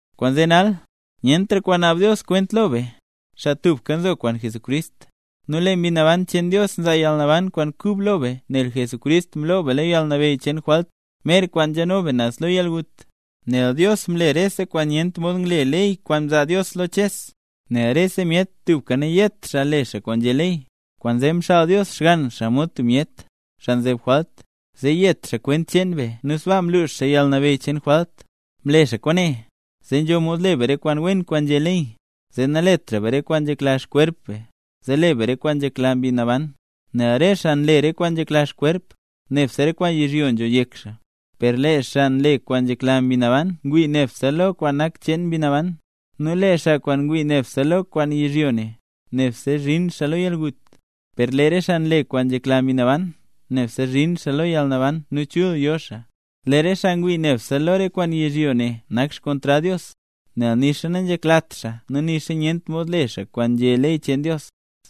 Kwaanzee nal, nyentra kwaan naab Dios kwent lo be, xaa tubka nzo kwaan Jesucrist. Nu lee Mbi Naban cheen Dios nzaa yalnaban kwaan kub lo be nel Jesucrist mloo be lo yalnabeyy cheen jwalt, mer kwaan nzhano be naz lo yalgut. Nel Dios mle rese kwaan nyent mod ngle ley kwaan mzaa Dios lo Ches, nel rese myet tubka nayet xaa le kwaan nzhé ley. Kwaanzee mxaal Dios Xgann xaa mod tub myet, xaa nzeb jwalt, zee yet xaa xkwent be nu sbaa mlux xaa yalnabeyy cheen jwalt. Mle xaa kwaane, zee nzho mod le be re kwaan wen kwaan nzhé ley, zee naletra be re kwaan nzhekla xkwerp be, zee le be kwaan nzhekla Mbi Naban. Nel re xaa nle re kwaan nzhekla xkwerp, nebse re kwaan yizhyo nzho yek xaa; per lee xaa nle kwaan nzhekla Mbi Naban, ngwii lo nebse re kwaan nak xcheen Mbi Naban. Nu lee xaa kwaan ngwii lo nebse re kwaan yizhyo ne, nebse zhin xaa lo yalgut; per lee re xaa nle kwaan nzhekla Mbi Naban, nebse zhin xaa lo yalnaban nu chul yo xaa. Lee re xaa ngwii nebse lo re kwaan yizhyo ne nak xkontrad Dios, nel nixa nanzheklat xaa nu nixa nyent mod le xaa kwaan nzhé ley cheen Dios.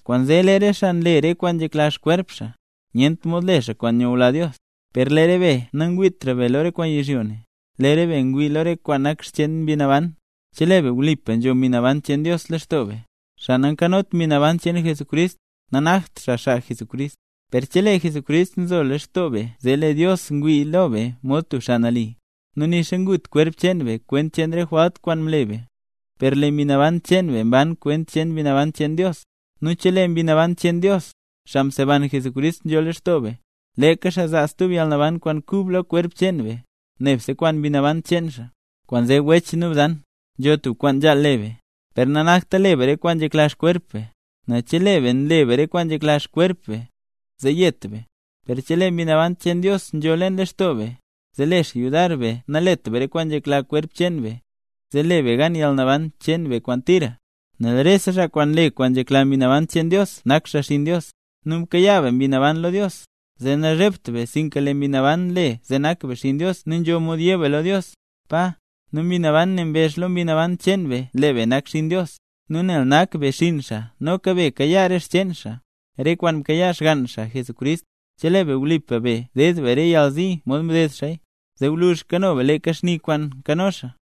Kwaanzee lee re xaa nle re kwaan nzhekla xkwerp xaa, nyent mod le xaa kwaan nyula Dios. Per lee re be nangwiitra be lo re kwaan yizhyo ne, lee re be ngwii lo re kwaan nak xcheen Mbi Naban, chelee be wlipa nzho Mbi Naban cheen Dios lextoo be. Xaa nanzhot Mbi Naban cheen Jesucrist lextoo, nanakt xaa xaa Jesucrist. Per chelee Jesucrist nzo lextoo be zee lee Dios ngwii lo be mod tub xaa nali, nu nixa ngut kwerp cheen be kwent cheen re jwalt kwaan mle be, per lee mbi naban cheen be mban kwent cheen Mbi Naban cheen Dios. Nu chelee Mbi Naban cheen Dios, xaa mseban Jesucrist, nzho lextoo be, leeka xaa zaa stub yalnaban kwaan kub lo kwerp cheen be, nebse kwaan Mbi Naban cheen xaa. Kwaanzee, wech nu bzan, nzho tub kwaan nzhaal le be, per nanakta le be re kwaan nzhekla xkwerp be. Nel chelee be nle be re kwaan nzhekla xkwerp be, zee yet be. Per chelee Mbi Naban cheen Dios nzho leen lextoo be, zee le xaa yudar be nalet be re kwaan nzhekla kwerp cheen be, zee le be gan yalnaban cheen be kwaan tira. Nel rese xaa nle kwaan nzhekla Mbi Naban cheen Dios nak xaa xinn Dios. Nu mkayaa be Mbi Naban lo Dios, zee nazhebt be, sinka lee Mbi Naban nle zee nak be xinn Dios nu nzho mod yé be lo Dios: “Pa”. Nu Mbi Naban ne mbezh lo mbi naban cheen be lee be nak xinn Dios. Nu nel nak be xinn xaa noka be kayaa re xcheen xaa, re kwaan mkayaa Xgann xaa Jesucrist, chelee be wlipa no be ded be re yalzi mod mded xaaya, zee gwluzh kano be leeka xni kwaan nkano xaa.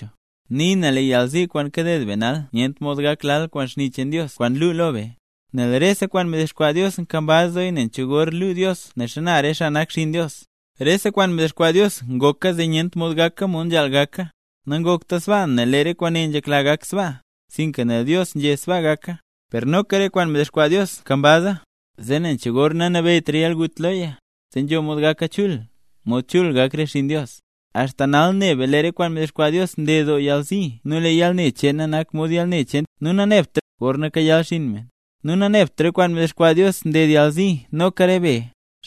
Nii na, lee yalzi kwaan kaded be nal nyent mod gak lal kwaan xni cheen Dios kwaan luu lo be. Nel rese kwaan mdexkwaa Dios nkambaz doo nen cho gor luu Dios ne xana re xaa nak xinn Dios. Rese kwaan mdexkwaa Dios ngoka zee nyent mod gaka mod nzhaal gaka. Nangokta sbaa nel lee re kwaane nzhekla gak sbaa, sinka nel Dios nzhé sbaa gaka. Per noka re kwaan mdexkwaa Dios nkambaza, zee nen cho gor nanabeyytra yalgut loya, zee nzho mod gaka chul, mod chul gak re xinn Dios. Axta nal ne be lee re kwaan mdexkwaa Dios nded doo yalzi nu lee yalne cheena nak mod yalne cheen tub ngwnaa, gorna kayal xinn me. Nu nanebt re kwaan mdexkwaa Dios nded yalzi noka re be,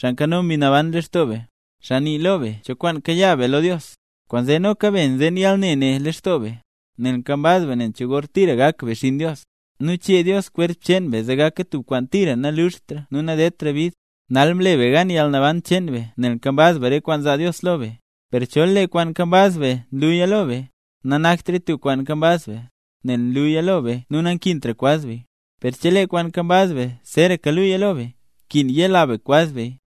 xaa nzho Mbi Naban lextoo be, xaa nii lo be cho kwaan kayaa be lo Dios. Kwaanzee noka be nzeen yalne ne lextoo be, nel nkambaz be nen cho gor tira gak be xinn Dios, nu chee Dios kwerp cheen be zee gaka tub kwaan tira naluxtra nu nadedtraya bid. Nal mle be gan yalnaban cheen be nel nkambaz be re kwaan zaa Dios lo be. Per chol lee kwaan nkambaz be nluya lo be, nanaktraya tub kwaan nkambaz be, nel nlulaya lo be nu nankintra kwaz beya. Per chelee kwaan nkambaz be zeeraka luya lo be, nkin yela be kwaz beya.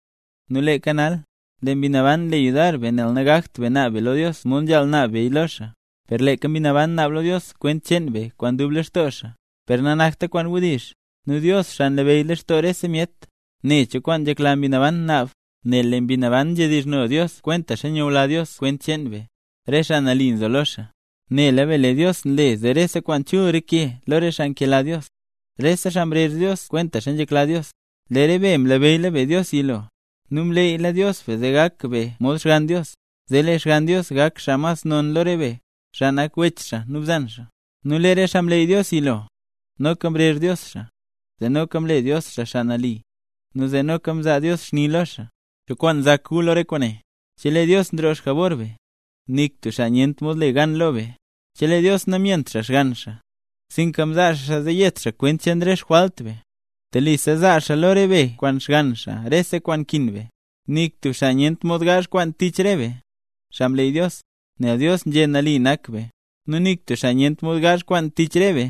Nu leeka nal, lee Mbi Naban nle yudar be nel nagakt be naab be lo Dios mod nzhaal naab be lo xaa. Per leeka Mbi Naban naab lo Dios kwent cheen be kwaan dub lextoo xaa, per nanakta kwaan wdizh. Nu Dios, xaa nlabeyy lextoo rese myet, ne cho kwaan nzhekla Mbi Naban naab, nel lee Mbi Naban nzhedizhno Dios kwentaxa nyula Dios kwent cheen be, xaa nambey. Nela be lee Dios nle zee rese kwaan chul reke lo re xaa nkela Dios, re xaa mrezh Dios kwentaxa nzhekla Dios. Lee re be mlabeyyla be Dios yilo, nu mleeyla Dios be zee gak be mod Xgann Dios, zee lee Xgann Dios gak xaa mas non lo re be, xaa nak wech xaa nu bzan xaa. Nu lee re xaa mleey Dios yilo, noka mrezh Dios xaa, nu zee noka mle Dios xaa xaa nali, zee noka mzaa Dios xni lo xaa. ¿Cho kwaan nzak gu lo re kwaane? ¡Chelee Dios nroo xjabor be, nik tub xaa nyent mod le gan lo be! Chelee Dios namyent xaa Xgann xaa, sinka mzaa xaa xaa zee yet xaa kwent re xjwalt be, telisa zaa xaa lo re be kwaan Xgann xaa rese kwaan nkin be. ¡Nik tub xaa nyent mod gaazh kwaan tich re be, xaa mleey Dios! Nel Dios nzhé nali nak be. Nu nik tub xaa nyent mod gaazh kwaan tich re be,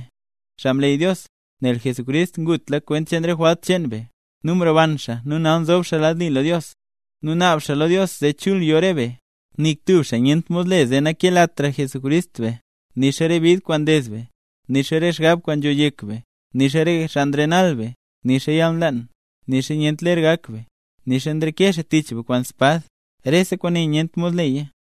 xaa mleey Dios, nel Jesucrist ngutla kwent cheen re jwalt cheen be, nu mroban xaa nu nal nzob xaa lad li lo Dios, nu naab xaa lo Dios zee chul yo re be. Nik tub xaa nyent mod le zee nakelatra Jesucrist be. Nixa re bid kwaan nded be, nixa re xgab kwaan nzho yek be, nixa re xaa nrenal be, nixa yalnlaan, nixa nyent ler gak be, nixa nreke xaa tich be kwaan espad, rese kwaane nyent mod leya.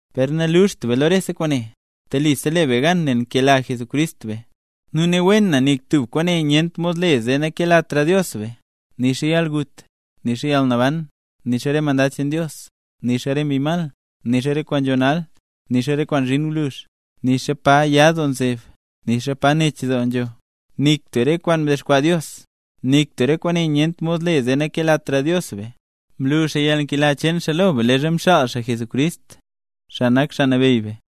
Per naluxt be lo rese kwaane. Telisa le be gan nel nkela Jesucrist be. Nu ne wen na nik tub kwaane nyent mod le zee nakelatra Dios be: nixa yalgut, nixa yalnaban, nixa re mandad cheen Dios, nixa re mbi mal, nixa re kwaan nzho nal, nixa re kwaan zhin gwluzh, nixa pa ya doo nzeb, nixa pa nech doo nzho, nik tub re kwaan mdexkwaa Dios. ¡Nik tub re kwaane nyent mod le zee nakelatra Dios be! Mlu xaa yalnkela cheen xaa lo be leezha mxaal xaa Jesucrist, xaa nak Xaa Nabeyy be.